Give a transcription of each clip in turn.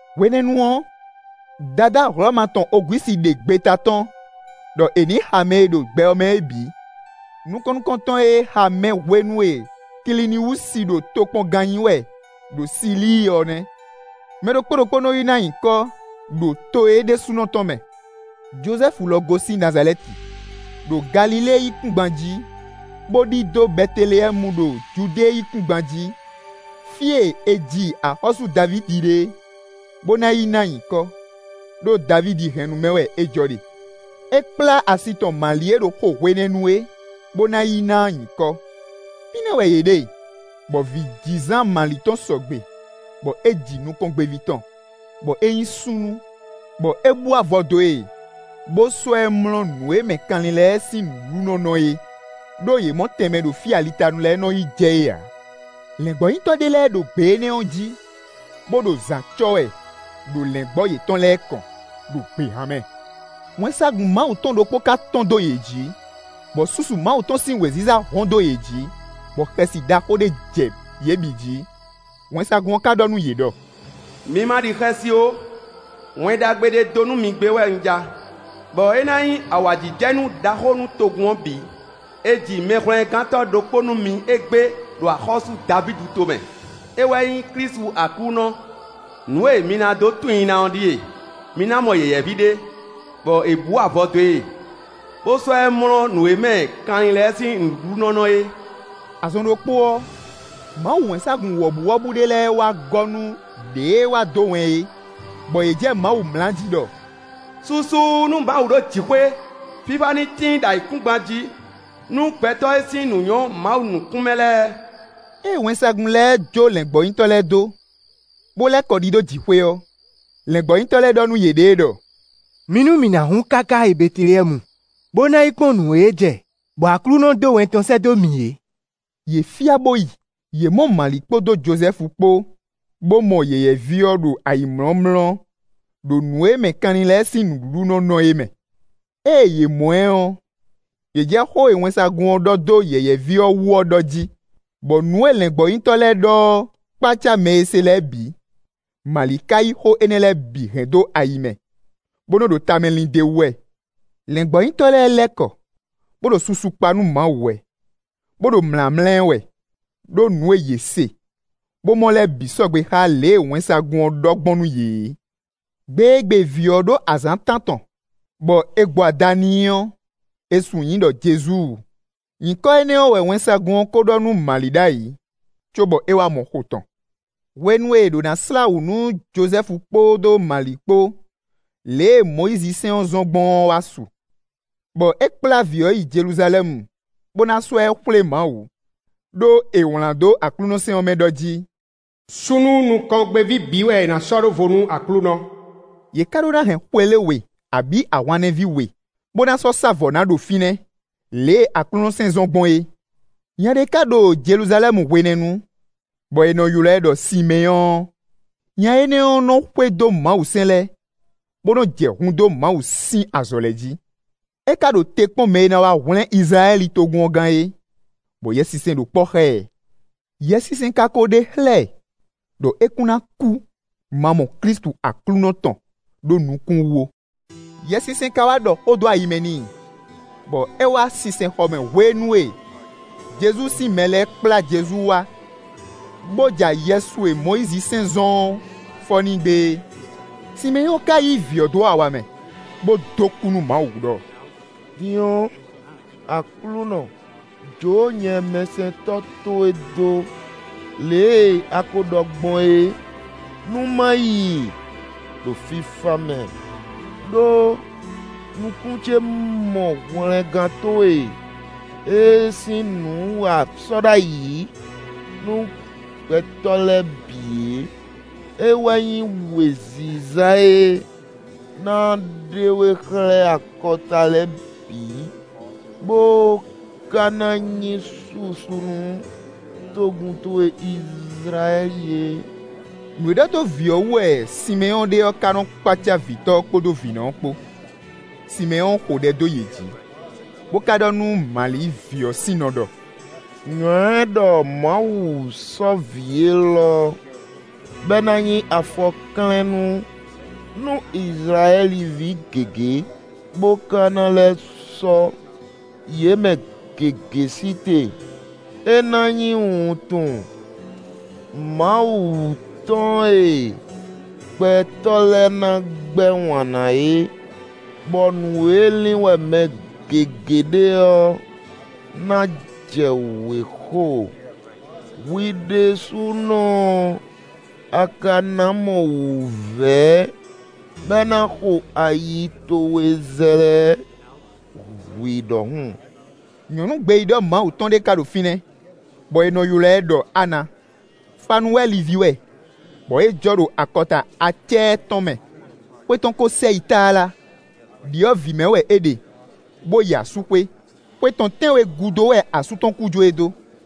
Hwenɛ́nu ɔ́, Dadá Hlɔ̌ma tɔn Ogwísi ɖe gbeta tɔ́n, ɖɔ è nǐ xa mɛ e ɖo gbɛ ɔ́ mɛ é bǐ. Nukɔn nukɔntɔn e è xa mɛ hwenu e è Kiliniwúsi ɖo tokpɔngán nyí wɛ ɖo Silíi ɔ́ nɛ́. Mɛ ɖokpó ɖokpó nɔ́ yi ná nyǐkɔ ɖo to é ɖésúnɔ tɔn mɛ. Jozɛ́fu lɔ gosín Nazalɛ́ti, ɖo Galilée yíkúngban jí, bó ɖidó Bɛteleyɛ́mu ɖo Judée yíkúngban jí, fí e è ji axɔ́sú Davídi ɖe é, bó ná yi ná nyǐkɔ; ɖó Davídi hɛ́nnu mɛ wɛ é jɔ ɖe. É kplá asi tɔn Mali e ɖo xo hwenɛ́nu é, bó ná yi ná nyǐkɔ. Fínɛ́ wɛ yě ɖe, bɔ vǐjizán Mali tɔn sɔgbe, bɔ é ji nukɔngbéví tɔn, bɔ é nyí súnnu, bɔ é bú avɔ dó e, bó sɔ́ ɛ mlɔ́ nǔ e mɛ kanlin lɛ́ɛ sín nǔɖuɖu nɔ́ nɔ é; ɖó yě mɔ tɛnmɛ ɖo fí e alitanu lɛ́ɛ nɔ yi jɛ é ǎ. Lɛ̌ngbɔ́nyitɔ́ ɖé lɛ́ɛ ɖo gbě énɛ́ ɔ́ jí, bó ɖo zǎn cɔ́ wɛ ɖo lɛ̌ngbɔ́ yětɔn lɛ́ɛ kɔn, ɖo gběhan mɛ. Wɛnsagun Mawu tɔn ɖokpó ká tɔ́n dó yě jí, bɔ susu Mawu tɔn sín wěziza hɔ́n dó yě jí, bɔ xɛsi ɖaxó ɖé jɛ yě bǐ jí. Wɛnsagun ɔ́ ka ɖɔ nú yě ɖɔ: “Mi ma ɖi xɛsi ó, Wɛn Ɖagbe ɖé dó mi gbé wɛ un ja, bɔ é ná nyí awǎjijɛnú ɖaxó nú togun ɔ́ bǐ. È ji Mɛhwlɛ́ngántɔ́ ɖokpó nú mi égbé ɖo axɔ́sú Davídi tomɛ; é wɛ nyí Klísu Aklúnɔ. Nǔ e mi na dó tunwun i ná ɔ́ ɖíe: mi ná mɔ yɛ̌yɛ́ví ɖé, bɔ è bǔ avɔ dó e, bo sɔ́ ɛ mlɔ́ nǔ e mɛ kanlin lɛ́ɛ sín nǔɖuɖu nɔ́ nɔ é.” Azɔn ɖokpó ɔ́, Mawu wɛnsagun wɔ̌buwɔ́bú ɖé lɛ́ɛ wá gɔ́ nú ɖěe wá dó wɛn é, bɔ yě jɛ Mawu mlá jí ɖɔ: “Susu nú Mawu ɖo jǐxwé, fífá ní tíin ɖo ayǐkúngban jí nú gbɛtɔ́ e sín nǔ nyɔ́ Mawu nukún mɛ lɛ́ɛ!” Ée wɛnsagun lɛ́ɛ jó lɛ̌ngbɔ́nyitɔ́ lɛ́ɛ dó, bo lɛ́ kɔ ɖidó jǐxwé ɔ́, lɛ̌ngbɔ́nyitɔ́ lɛ́ɛ ɖɔ nú yěɖée ɖɔ: “Mi nú mi na hun káká yi Bɛteleyɛ́mu, bó ná yi kpɔ́n nǔ e jɛ bɔ Aklúnɔ dó wɛn tɔn sɛ́ dó mǐ é.” Yě fyá bó yi. Yě mɔ Mali kpódó Jozɛ́fu kpó, bó mɔ yɛ̌yɛ́ví ɔ́ ɖo ayǐmlɔ́mlɔ́ ɖo nǔ e mɛ kanlin lɛ́ɛ sín nǔɖuɖu nɔ́ nɔ é mɛ. Ée yě mɔ ɛ ɔ́, yě jɛ xó e wɛnsagun ɔ́ ɖɔ dó yɛ̌yɛ́ví ɔ́ wú ɔ́ ɖɔ jí. Bɔ nǔ e lɛ̌ngbɔ́nyitɔ́ lɛ́ɛ ɖɔ ɔ́ kpácá mɛ e se lɛ́ɛ bǐ. Mali ka yí xó énɛ́ lɛ́ɛ bǐ hɛn dó ayi mɛ, bó nɔ́ ɖo tamɛ lin d'é wú wɛ. Lɛ̌ngbɔ́nyitɔ́ lɛ́ɛ lɛ́ kɔ, bó ɖo susu kpa nú Mawu wɛ, bó ɖo mlǎmlá ɛ wɛ, ɖó nǔ e yě se, bó mɔ lɛ́ɛ bǐ sɔgbe xá lě e wɛnsagun ɔ́ ɖɔ gbɔn nú yě é. Gbe e gbe vǐ ɔ́ ɖó azǎn tántɔn, bɔ è gbo ada n'i ɔ́, è sun nyǐ i ɖɔ “Jezu”; nyǐkɔ énɛ́ ɔ́ wɛ wɛnsagun ɔ́ ko ɖɔ nú Mali ɖ'ayǐ, cóbɔ é wá mɔ xo tɔn. Hwenu e è ɖǒ ná slá wǔ nú Jozɛ́fu kpódó Mali kpó lě e Mɔyízi sɛ́n ɔ́ zɔ́n gbɔn ɔ́ wá su, bɔ é kplá vǐ ɔ́ yi Jeluzalɛ́mu, bó ná sɔ́ ɛ xwlé Mawu. Đó è wlǎn dó Aklúnɔ sɛ́n ɔ́ mɛ ɖɔ jí: “Súnnu nukɔngbéví bǐ wɛ è nǎ sɔ́ ɖó vo nú Aklúnɔ.” Yě ká ɖó ná hɛn xwelé we, abǐ ahwannɛ́ví we, bó ná sɔ́ sá vɔ̌ ná ɖo fínɛ́, lě e Aklúnɔ sɛ́n zɔ́n gbɔn é. Nya ɖé ka ɖo Jeluzalɛ́mu hwenɛ́nu, bɔ è nɔ ylɔ́ ɛ ɖɔ Simɛ́nyɔ́ɔ. Nya énɛ́ ɔ́ nɔ́ xwedó Mawusɛ́n lɛ́ɛ, bó nɔ́ jɛ hun dó Mawu sín azɔ̌ lɛ́ɛ jí. É ká ɖo te kpɔ́n mɛ e ná wá hwlɛ́n Izlayɛ́li togun ɔ́ gán é, bɔ Yɛsinsɛn ɖo kpɔ́ xá ɛ. Yɛsinsɛn ka ko ɖe xlɛ́ ɛ ɖɔ é kún ná kú ma mɔ Klísu Aklúnɔ tɔn ɖó nukún wú ó. Yɛsinsɛn ka wá ɖɔ xó dó ayi mɛ n'i, bɔ é wá sinsɛnxɔ mɛ hwenu e Jezu sín mɛ lɛ́ɛ kplá Jezu wá, bó ja yɛsu e Mɔyízisɛ́n zɔ́n ɔ́ fɔ n'i gbé é. Simɛ́nyɔ́ɔ ka yí vǐ ɔ́ dó awa mɛ, bó dó kú nú Mawu ɖɔ: “Din ɔ́, Aklúnɔ, jǒ nyɛ mɛsɛntɔ́ towe dó, lě e a ko ɖɔ gbɔn é, nú ma yi ɖo fífá mɛ; ɖó nukún ce mɔ hwlɛngán towe e sín nǔ a sɔ́ ɖ'ayǐ nú gbɛtɔ́ lɛ́ɛ bǐ é: é wɛ nyí wěziza e ná ɖe we xlɛ́ akɔta lɛ́ɛ bǐ, bó ká ná nyí susu nú togun towe Izlayɛ́li é.” Nǔ e ɖɔ dó vǐ ɔ́ wú wɛ Simɛ́nyɔ́ɔ ɖe ɔ́ ká nɔ́ kpácá vǐtɔ́ ɔ́ kpódó vǐnɔ ɔ́ kpó. Simɛ́nyɔ́ɔ xo ɖɛ dó yě jí, bó ká ɖɔ nú Mali vǐ ɔ́ sín nɔ ɖɔ: “Nywɛ̌ ɖɔ Mawu sɔ́ vǐ élɔ́, bɔ é ná nyí afɔklɛ́nnú nú Izlayɛ́li ví gěgé, bó ká ná lɛ́ sɔ́ yě mɛ gěgé sí te. É ná nyí wuntun Mawu tɔn e gbɛtɔ́ lɛ́ɛ ná gbɛ́ wǎn ná é, bɔ nǔ e lin wɛ mɛ gěgé ɖe ɔ́ ná jɛ wěxo. Hwi ɖésúnɔ ɔ́, a ka ná mɔ wǔvɛ́, bɔ é ná xo ayi towe zlɛ́ hwǐ ɖɔhun.” Nyɔ̌nu gbeyíɖɔ Mawu tɔn ɖé ka ɖo fínɛ́, bɔ è nɔ ylɔ́ ɛ ɖɔ Ana; Fanuwɛli ví wɛ, bɔ é jɔ ɖo akɔta Acɛ́ɛ tɔn mɛ; xwe tɔn ko sɛ yi tlala. Đyɔ̌vǐ mɛ wɛ é ɖe, bó yi asúxwé. Xwe tɔn tɛ́nwe gúdo wɛ asú tɔn kú jó e dó.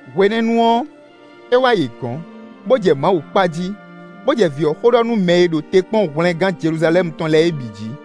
Hwenɛ́nu ɔ́, é wá yě gɔ̌n, bó jɛ Mawu kpa jí, bó jɛ vǐ ɔ́ xó ɖɔ nú mɛ e ɖo te kpɔ́n hwlɛngán Jeluzalɛ́mu tɔn lɛ́ɛ é bǐ jǐ.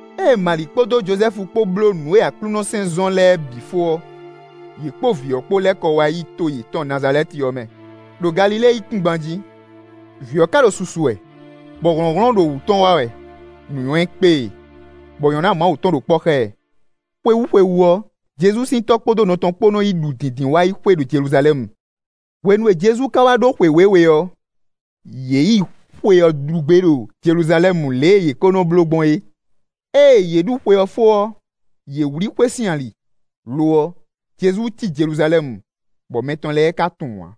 Ée Mali kpódó Jozɛ́fu kpó bló nǔ e Aklúnɔ sɛ́n zɔ́n lɛ́ɛ bǐ fó ɔ́, yě kpó vǐ ɔ́ kpó lɛ́ kɔ wá yi to yětɔn Nazalɛ́ti ɔ́ mɛ, ɖo Galilée yíkúngban jí. Vǐ ɔ́ ka ɖo susu wɛ, bɔ hlɔ̌nhlɔ́n ɖo wǔ tɔn wá wɛ; nǔnywɛ́ kpé e; bɔ nyɔ̌ná Mawu tɔn ɖo kpɔ́ xá ɛ. Xwewú xwewú ɔ́, Jezu sín tɔ́ kpódó nɔ tɔn kpó nɔ́ yi ɖu Dǐndínwáyixwe ɖo Jeluzalɛ́mu. Hwenu e Jezu ka wá ɖó xwe wěwe ɔ́, yě yi xwe ɔ́ ɖu gbé ɖo Jeluzalɛ́mu lě e yě kó nɔ́ bló gbɔn é. Ée yě ɖu xwe ɔ́ fó ɔ́, yě wlí xwé sín ali; lo ɔ́, Jezu cí Jeluzalɛ́mu, bɔ mɛ tɔn lɛ́ɛ ká tunwun ǎ.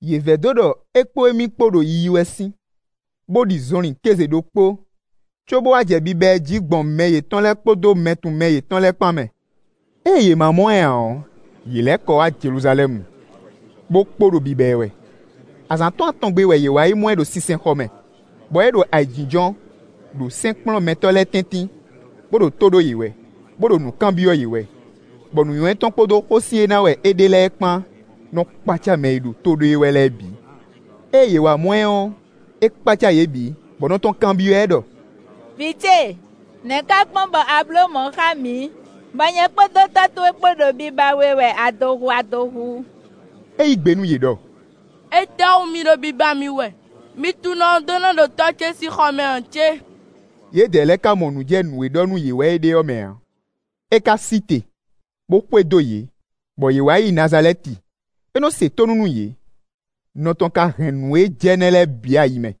Yě vɛdó ɖɔ é kpó émí kpó ɖo yiyi wɛ sín, bó ɖi zɔnlin kéze ɖokpó, cóbó wá jɛ biba ɛ jí gbɔn mɛ yětɔn lɛ́ɛ kpódó mɛtunwunmɛ yětɔn lɛ́ɛ kpán mɛ. Ée yě má mɔ ɛ ǎ ɔ́, yě lɛ́ kɔ wá Jeluzalɛ́mu, bó kpo ɖo biba ɛ wɛ. Azǎn tɔn atɔn gbe wɛ yě wá yi mɔ ɛ ɖo sinsɛnxɔ mɛ, bɔ é ɖo ayǐjínjɔ́n, ɖo sɛ́nkplɔ́nmɛtɔ́ lɛ́ɛ tɛ́ntin, bó ɖo tó ɖó yě wɛ, bó ɖo nǔ kanbyɔ́ yě wɛ, bɔ nǔnywɛ́ tɔn kpódó xósin e ná wɛ é ɖe lɛ́ɛ kpán nɔ́ kpácá mɛ e ɖo tó ɖó e wɛ lɛ́ɛ bǐ. Ée yě wá mɔ ɛ ɔ́, é kpácá yě bǐ, bɔ nɔ tɔn kanbyɔ́ ɛ ɖɔ: “Vǐ ce, nɛ̌ ká gbɔn bɔ a blǒ mɔ̌ xá mǐ, bɔ nyɛ kpódó tɔ́ towe kpo ɖo biba we wɛ adohu adohu?” É yí gbe nú yě ɖɔ: “Étɛ́wú mi ɖo biba mì wɛ? Mi tunwun ɖɔ un ɖó ná ɖo tɔ́ ce sín xɔ mɛ ǎ cé?” Yědɛɛ lɛ́ɛ ka mɔ nǔ jɛ nǔ e ɖɔ nú yě wɛ é ɖe ɔ́ mɛ ǎ. É ka sí te, bó xwedó yě, bɔ yě wá yi Nazalɛ́ti; é nɔ́ se tónú nú yě. Nɔ tɔn ka hɛn nǔ e jɛ nɛ́ lɛ́ɛ bǐ ayi mɛ.